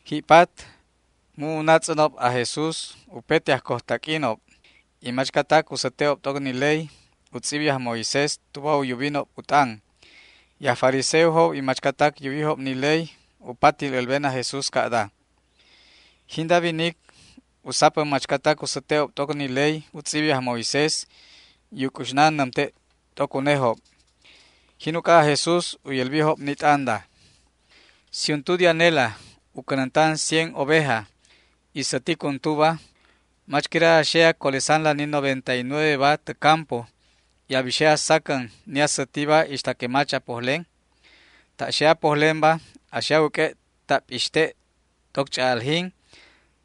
Ji'pat, mu' u natz'änob aj Jesús upete ajcojtaq'uinob y machcatac u säte'ob t'oc ni ley u tz'ibi aj Moisés tuba u yubinob u t'an. Y aj fariseojob y machcatac yuwijob ni ley u patil älben aj Jesús ca'da: ―Jinda winic u sapän machcatac u säte'ob t'oc ni ley u tz'ibi aj Moisés y u c'uxnan nämte' t'oc unejob. Jin uc'a aj Jesús u yälbijob ni t'anda: ―Si untu de anela a cänäntan cien oveja y sätic untuba, ¿mach quira a xe a colesan ni noventa y nueveba tä campo y a bixe a sacän ni asätiba ixta que mach a pojlen? Ta' xe a pojlenba a xe a wäq'ue' ta' p'ixte' t'oc ch'a'aljin.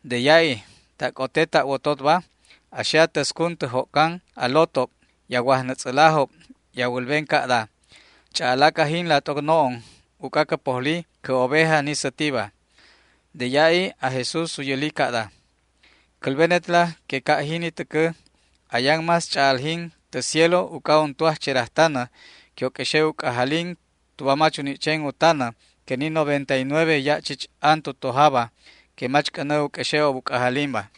De ya'i ta' c'ote ta' wototba a xe a täscun tä jo'can a lotob y a wajnätz'älajob y a wälben ca'da: “Ch'a'alac ajinla t'oc no'on uc'a cä pojli cä oveja ni sätiba”. De ya'i aj Jesús u yäli ca'da: ―Cälbenetla que ca' jini täcä ayan más ch'a'aljin tä cielo uc'a untu ajcherajtanä que u q'uexe' u c'ajalin tuba mach u ni' chen u tanäba que ni noventa y nueve ya' chich an tu tojaba que mach c'änä u q'uexe'ob u c'ajalinba.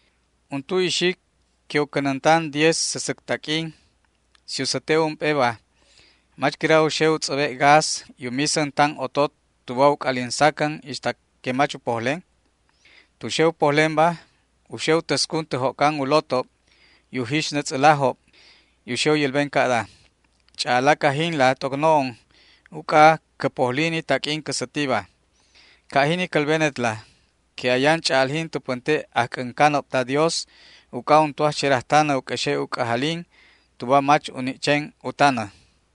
’Untu ixic que u cänäntan diez säsäc taq'uin, si u säte' ump'eba, ¿mach quira u xe u tz'äbe' gas y u misän tan otot tuba u c'alin sacän ixta que mach u pojlen? Tu xe u pojlenba u xe u täscun tä jo'can u lotob y u jixnätz'älajob y u xe u yälben ca'da: “Ch'a'alac ajinla t'oc no'on uc'a cä pojli ni taq'uin cä sätiba”. Ca' jini cälbenetla que ayan ch'a'aljin tu pänte' ajc'äncanob ta Dios uc'a untu ajcherajtanä u q'uexe' u c'ajalin tuba mach u ni' chen u tanäba.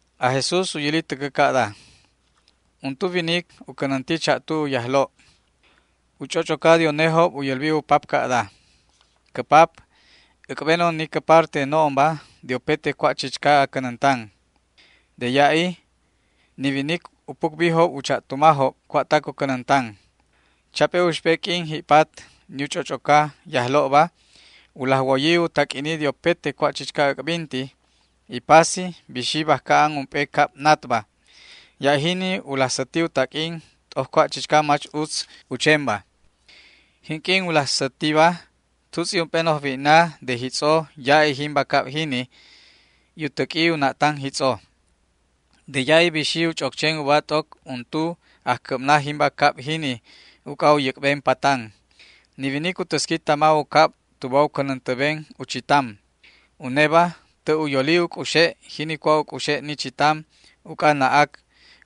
Aj Jesús u yäli täcä ca'da: ―Untu winic u cänänti cha'tu u yajlo'. U ch'och'oca de unejob u yälbi u pap ca'da: “Cä pap, äc'benon ni cä parte no'onba de upete cua' chichca a cänäntan”. De ya'i ni winic u pucbijob u cha'tumajob cua'tac u cänäntan. Chap'e uxp'e q'uin ji'pat ni u ch'och'oca yajlo'ba u laj woyi u taq'uini de upete cua' chichca äc'binti y pasi bixi bajca an ump'e cab natba. Ya' jini u laj säti u taq'uin t'oc cua' chichca mach utz u chenba. Jinq'uin u laj sätiba tutz'i ump'e noj wi'na de jitz'o ya'i jimba cab jini, y u täq'ui u na'tan jitz'o. De ya'i bixi u ch'oc chen uba t'oc untu ajcäbna jimba cab jini uc'a u yäc'ben patan. Ni winic u täsqui tama u cab tuba u cänäntäben u chitam. Uneba tä' u yoli u c'uxe' jini cua' u c'uxe' ni chitam uc'a na'ac,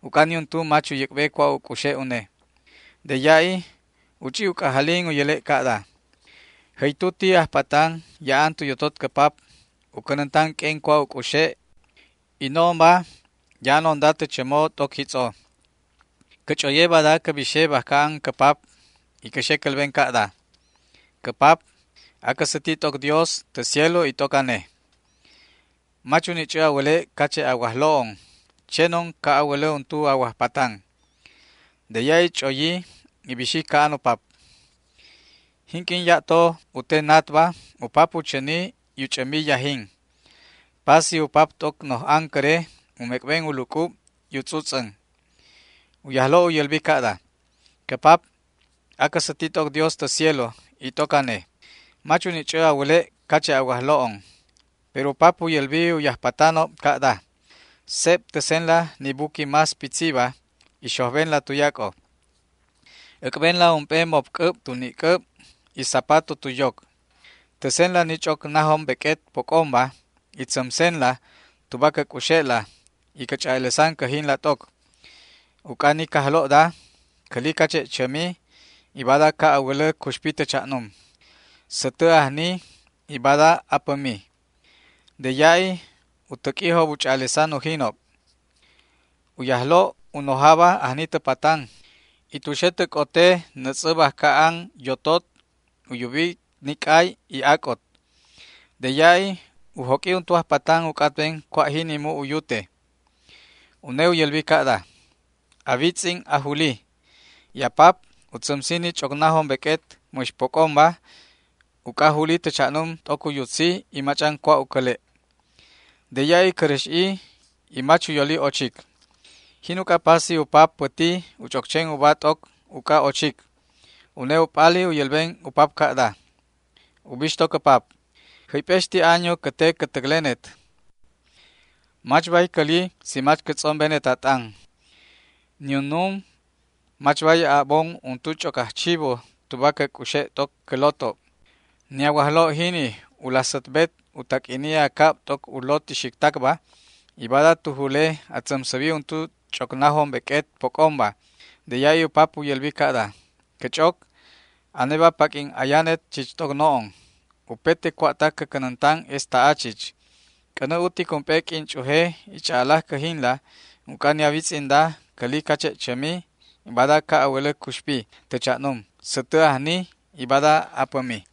uc'a niuntu mach u yäc'be cua' u c'uxe' une. De ya'i u ch'i u c'ajalin u yäle' ca'da: “¡Jäytu ti ajpatan ya'an tu yotot cä pap u cänäntan q'uen cua' u c'uxe', y no'onba ya'anonda tä chämo t'oc jitz'o! Cä ch'oye bada cä bixe bajca an cä pap y cä xe cälben ca'da: Cä pap, acä säti t'oc Dios tä cielo y t'oc ane. Mach u ni' ch'ä a wäle' cache' a wajlo'on; chenon ca' a wälä untu a wajpatan”. De ya'i ch'oyi y bixi ca'an u pap. ’Jinq'uin ya'to u te natba u pap u chäni y u ch'ämbi yajin. Pasi u pap t'oc noj ancäre u mec'ben u luc'ub y u tz'utz'än. U yajlo' u yälbi ca'da: “Cä pap, acä säti t'oc Dios tä cielo y t'oc ane. Mach u ni' ch'ä a wäle' cache' a wajlo'on”. Pero u pap u yälbi u yajpatanob ca'da: “Seb täsenla ni buqui más pitziba y xojbenla tuyac'o. Äc'benla ump'e mopc'äb tu ni'c'äb y zapato tu yoc. Täsenla ni ch'oc najom beq'uet poc'omba y tzämsenla tuba cä c'uxe'la, y cä ch'a'alesan cäjinla t'oc. Uc'a ni cajlo'da cäli cache' chämi, y bada ca' a wälä cuxpi tä cha'num; sätä ajni y bada apämi”. De ya'i u täq'uijob u ch'a'alesan ujinob. ’U yajlo' u nojaba ajni tä patan, y tu xe tä c'ote nätz'ä bajca an yotot u yubi ni c'ay y ac'ot. De ya'i u joq'ui untu ajpatan u c'atben cua' jini mu' u yute. Une u yälbi ca'da: “A witz'in ajuli, y a pap u tzämsi ni ch'oc najom beq'uet mäx poc'omba uc'a juli tä cha'num t'oc u yutzi y mach'an cua' u cäle'”. De ya'i cäräx'i y mach u yoli ochic. Jin uc'a pasi u pap päti u ch'oc chen uba t'oc uc'a ochic. Une u p'ali u yälben u pap ca'da: “Ubixto cä pap, jäyp'exti año cä te cä täclenet; mach bay cäli si mach cä tz'ombenet a t'an. Niunum mach bay a'bon untu ch'oc ajchibu tuba cä c'uxe' t'oc cä lotob. Ni a wajlo' jini u laj sätbet u taq'uini a cab t'oc u lot ixictacba, y bada tu jule a tzämsäbi untu ch'oc najom beq'uet poc'omba”. De ya'i u pap u yälbi ca'da: “Cä ch'oc, aneba paq'uin ayanet chich t'oc no'on; upete cua'tac cä cänäntanba es ta'a chich. C'änä utic ump'e q'uin ch'uje y ch'a'alac cäjinla, uc'a ni a witz'inda, cäli cache' chämi, y bada ca' a wälä cuxpi tä cha'num; sätä ajni y bada apämi”.